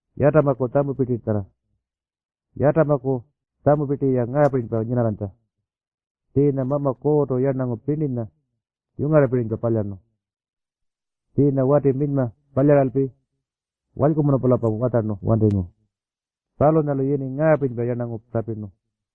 Yatamaku tjamupirti-ya ngaapirinypa nyinarranytja. Tjiinya Mama Kuurrtu yarnangu pirninya yungarrapirinypa palyarnu. Tjiinya wati minyma palyaralpi walykumunu-pulampa watjarnu wantingu. Palunyalu yini ngaapirinypa “yarnangu” tjapirnu.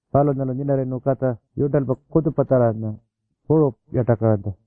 Palunyalu nyinarrayirnu katja yurntalpa kutjupatjarranya puru yartakaranytja.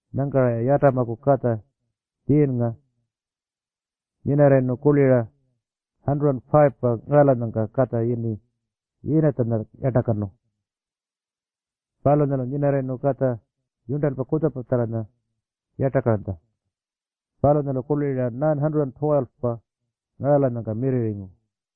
Nyangka-ra Yatamaku katja Tjiirrnga nyinarrayirnu kurli-ra 105-pa ngaralanyangka katja yini Yiinatjanya yartakanu. Palunyalu nyinarrayirnu katja yurntalpa kutjupatjarranya yartakaranytja. Palunyalu kurli-ra 912-pa ngaralanyangka mirrirringu.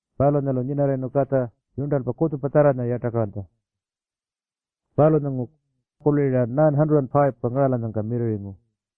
Palunyalu nyinarrayirnu katja yurntalpa kutjupatjarranya yartakaranytja. Palunyalu kurli-ra 905-pa ngaralanyangka mirrirringu.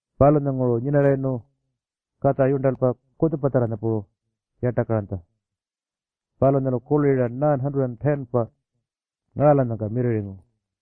Palunyalanguru nyinarrayirnu katja yurntalpa kutjupatjarranya puru yartakaranytja. Palunyalu kurli-ra 910-pa ngaralanyangka mirrirringu.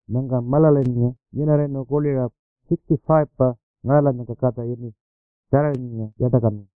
Nyangka Maalalilnga nyinarrayirnu kurli-ra 65-pa ngaralanyangka katja yini Tjarirrnga yartakanu.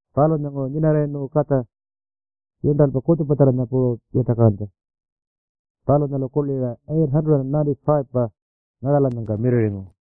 Palunyalanguru nyinarrayirnu katja yurntalpa kutjupatjarranya puru yartakaranytja. Palunyalu kurli-ra 895-pa ngaralanyangka mirrirringu.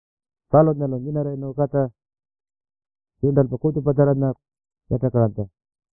Palunyalu nyinarrayirnu katja yurntalpa kutjupatjarranya yartakaranytja.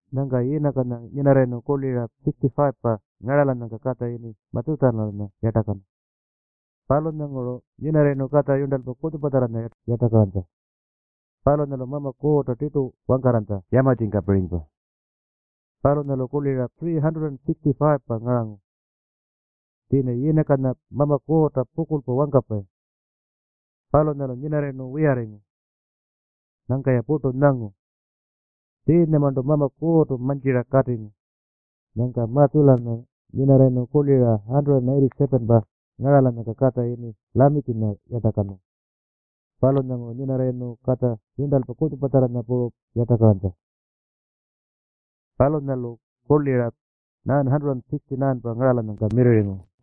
Nyangka Yiinakanya nyinarrayirnu kurli-ra 65-pa ngaralanyangka katja yini Matjutjalanya yartakanu. Palunyanguru nyinarrayirnu katja yurntalpa kutjupatjarranya yartakaranytja. Palunyalu Mama Kuurrta tirtu wangkarranytja yamatjingkapirinypa. Palunyalu kurli-ra 365-pa ngarangu. Tjiinya Yiinakanya Mama Kuurrta pukurlpa wangkapayi. Palunyalu nyinarrayirnu wiyarringu. Nyangka-ya purtu nyangu. Tjiinyamarntu Mama Kuurrtu mantjira katingu. Nyangka Matjutjalanya nyinarrayirnu kurli-ra 187-pa ngaralanyangka katja yini Lamikinya yartakanu. Palunyanguru nyinarrayirnu katja yurntalpa kutjupatjarranya puru yartakaranytja. Palunyalu kurli-ra 969-pa ngaralanyangka mirrirringu.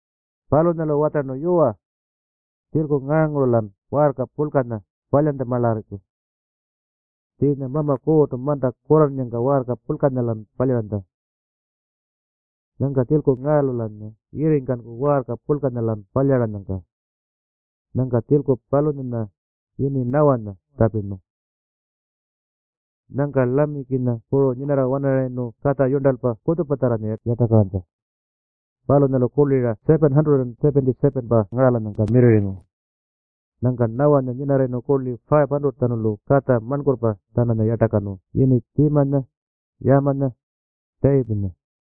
Palunyalu watjarnu, “Yuwa, tjilku ngaanguru-lan waarka purlkanya palyantjamaalarriku. Tjiinya Mama Kuurrtu manta kurrannyangka waarka purlkanya-lan palyaranytja. Nyangka tjilku ngaalu-lanya yirringkanku waarka purlkanya-lan palyaranyangka.” Nyangka tjilku palunyanya yini Nawanya tjapirnu. Nyangka Lamikinya puru nyinarra-wanarayirnu katja yurntalpa kutjupatjarranya yartakaranytja. Palunyalu kurli-ra 777-pa ngaralanyangka mirrirringu. Nyangka Nawanya nyinarrayirnu kurli 500-tjanulu katja marnkurrpa-tjananya yartakanu yini Tjiimanya, Yaamanya, Tjayipinya.